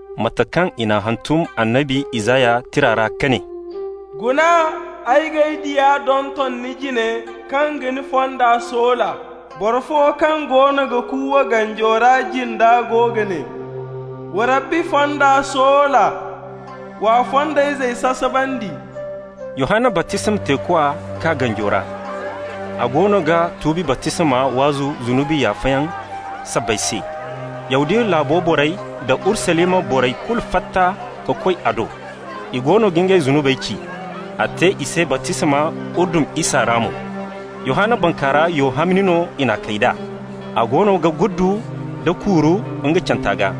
Mate kaŋ i n'a hantum annabi Isaya tira ra ka ne: «Guna, ay g'ay diya donton ni jine, kaŋ ga ni fonda soola. Boro fo kaŋ goono ga kuuwa ganjo ra jinda go ga ne: ‹Wa Rabbi fonda soola, w'a fondayzey sasabandi.›» Yohanna baptisma teekwa kaa ganjo ra. A goono ga tuubi baptisma waazu zunubi yaafayaŋ sabbay se. Yahudiya laabo borey da Urusalima borey kulu fatta ka koy a do. I goono ga ngey zunubey ci. A te i se baptisma Urdun isa ra mo. Yohanna bankaara, yo hamni no i n'a kay d'a. A goono ga guddu nda kuuru nga canta gaa.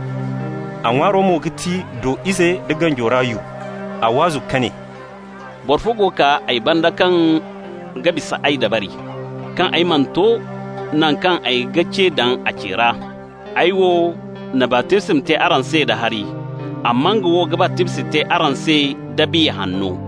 A ŋwaaro mo ga ti do-ize da ganjo ra yu. A waazu ka ne: «Boro fo go kaa ay banda kaŋ ga bisa ay dabari, kaŋ ay mana to naŋ kaŋ ay ma ce daŋ a ce ra. Ay wo na baptisma te araŋ se da hari, amma nga wo ga baptisma te araŋ se da Biya Hanno.»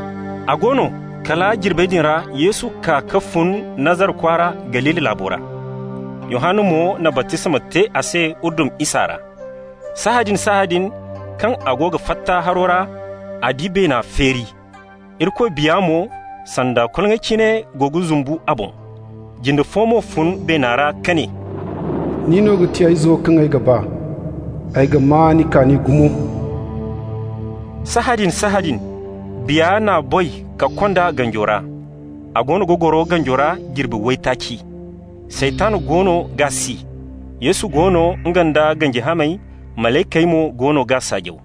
A go no, kala jirbey din ra Yesu kaa ka fun Nazara kwaara, Galili laabo ra. Yohanna mo na baptisma te a se Urdun isa ra. Sahãadin-sahãadin, kaŋ a go ga fatta haro ra, a di beena feeri. Irikoy Biya mo, sanda koloŋay cine, go ga zumbu a boŋ. Jinde fo mo fun beena ra ka ne: «Nin no ga ti ay Izo kaŋ ay ga ba. Ay ga maa ni kaani gumo.» Sahãadin-sahãadin Biya n'a boy ka kond'a ganjo ra. A goono ga goro ganjo ra jirbi waytaaci. Saytan goono g'a si. Yesu go no, nga nda ganji hamey, malaykey mo goono g'a saajaw.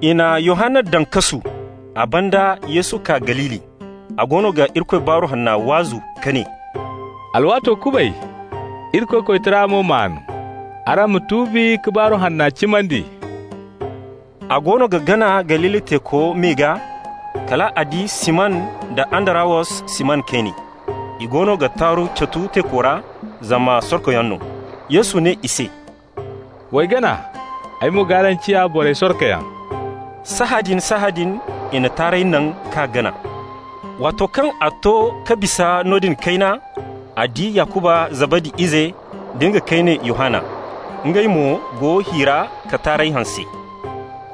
I na Yohanna daŋ kasu. A banda Yesu kaa Galili. A goono ga Irikoy baaru hanna waazu ka ne: «Alwaato kubay. Irikoy koytara mo maan. Araŋ ma tuubi ka baaru hanna cimandi.» A goono ga gana Galili teeko me gaa, kal a di Siman da Andarawos, Siman kayne. I goono ga taaru catu teeko ra, zama sorkoyaŋ no. Yesu ne i se: «W'ay gana, ay mo g'araŋ ciya borey sorkoyaŋ.» Sahãadin-sahãadin i na taarey naŋ k'a gana. Waato kaŋ a to ka bisa noodin kayna, a di Yakuba Zabadi ize, da nga kayne Yohanna. Ngey mo go hi ra ka taarey hanse.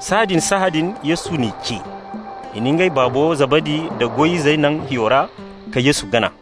Sahãadin-sahãadin Yesu n'i ce. I na ngey baabo Zabadi nda goy-izey naŋ hiyo ra, ka Yesu gana.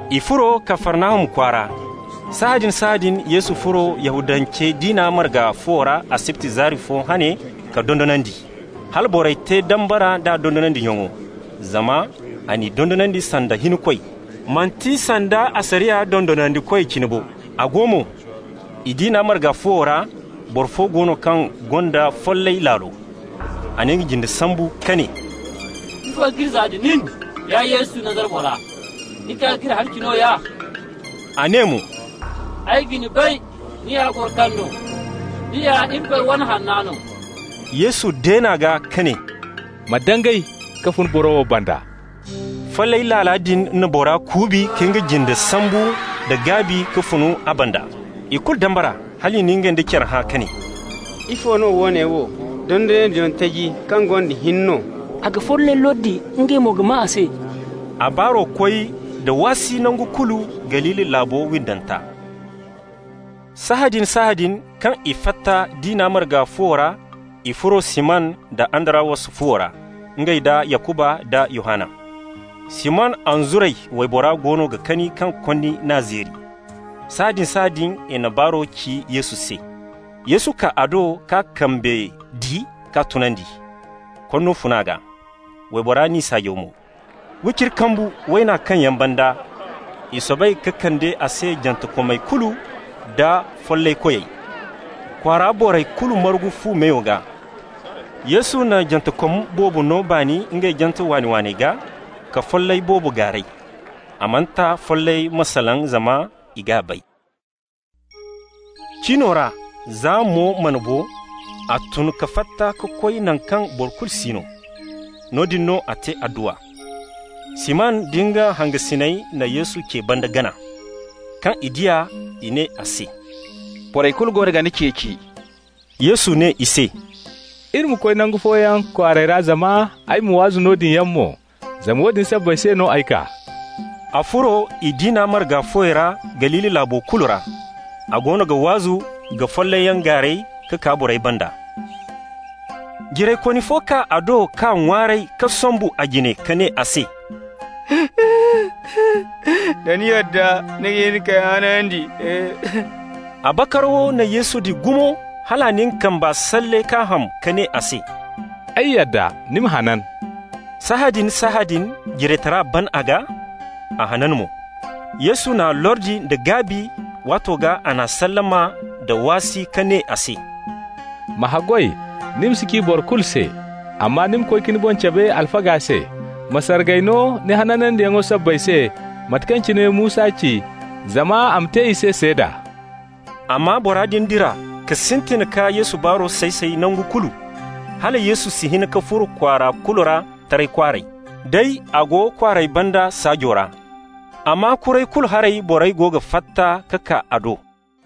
I furo Kafarnahum kwaara. Sahãadin-sahãadin Yesu furo Yahudance diina marga fuwo ra asibti zaari fo hane ka dondonandi. Hala borey te dambara nd'a dondonandiyaŋo, zama a n'i dondonandi sanda hinkoy, manti sanda asariya dondonandikoy cine bo. A go mo, i diina marga fuwo ra, boro fo go no kaŋ gonda follay laalo. A na nga jinde sambu ka ne: «Ifo k'iri zaa da nin, ya Yesu, Nazara bora? Ni kaa k'iri halaci nooya?» A ne mo: «Ay ga ni bay, ni ya boro kaŋ no. Ni ya Irikoy wane hanna no.» Yesu deen'a gaa ka ne: «Ma dangay ka fun boro wo banda.» Follay laala din na bora kuubi ka nga jinde sambu nda gaabi ka fun a banda. I kulu dambara hal i na ngey nda care hã ka ne: «Ifo no woone wo? Dondonandiyaŋ taji kaŋ gonda hin no! A ga follayey lordi, ngey mo go ga maa a se.» A baaro koy da waasi nangu kulu Galili laabo windanta. Sahãadin-sahãadin kaŋ i fatta diina marga fuwo ra, i furo Siman da Andarawos fuwo ra, ngey nda Yakuba nda Yohanna. Siman anzuray waybora goono ga kani kaŋ konni n'a zeeri. Sahãadin-sahãadin i na baaro ci Yesu se. Yesu kaa a do k'a kambe di k'a tunandi. Konno fun a gaa. Waybora n'i saajaw mo. Wiciri kambu wayna kaŋyaŋ banda, i soobay ka kande a se jantekomey kulu nda follaykoyey. Kwaara borey kulu margu fu meyo gaa. Yesu na jantekom boobo no baani ngey jante waani-waaney gaa, ka follay boobo gaaray. A mana ta follayey ma salaŋ, zama i g'a bay. Cino ra, za mo mana bo, a tun ka fatta ka koy naŋ kaŋ boro kulu si no. Noodin no a te adduwa. Siman da nga hangasiney na Yesu ce banda gana. Kaŋ i di a, i ne a se: «Borey kulu goono ga ni ceeci.» Yesu ne i se: «Iri ma koy nangu fooyaŋ kwaarey ra zama ay ma waazu noodin yaŋ mo, zama woodin sabbay se no ay kaa.» A furo i diina marga fuwey ra Galili laabo kulu ra. A goono ga waazu ka follayyaŋ gaaray ka kaa borey banda. Jiraykooni fo kaa a do k'a ŋwaaray ka sombu a jine ka ne a se: «Da ni yadda, ni ga hin k'ay hanandi.» A bakarawo na Yesu di gumo hal a na nga kamba salle k'a ham, ka ne a se: «Ay yadda. Ni ma hanan.» Sahãadin-sahãadin jiraytara ban a gaa. A hanan mo. Yesu n'a lordi nda gaabi, waato gaa a n'a sallama nda waasi ka ne a se: «Ma haggoy ni ma si ci boro kulu se. Amma ni ma koy ka ni boŋ cabe alfaga se. Ma sargay no ni hanandiyaŋo sabbay se mate kaŋ cine Musa ci, zama a ma te i se seeda.» Amma bora din dira ka sintin ka Yesu baaro say-say nangu kulu. Hala Yesu si hin ka furo kwaara kulu ra taray kwaaray, day a go kwaarey banda saajo ra. Amma kuray kulu haray borey go ga fatta ka kaa a do.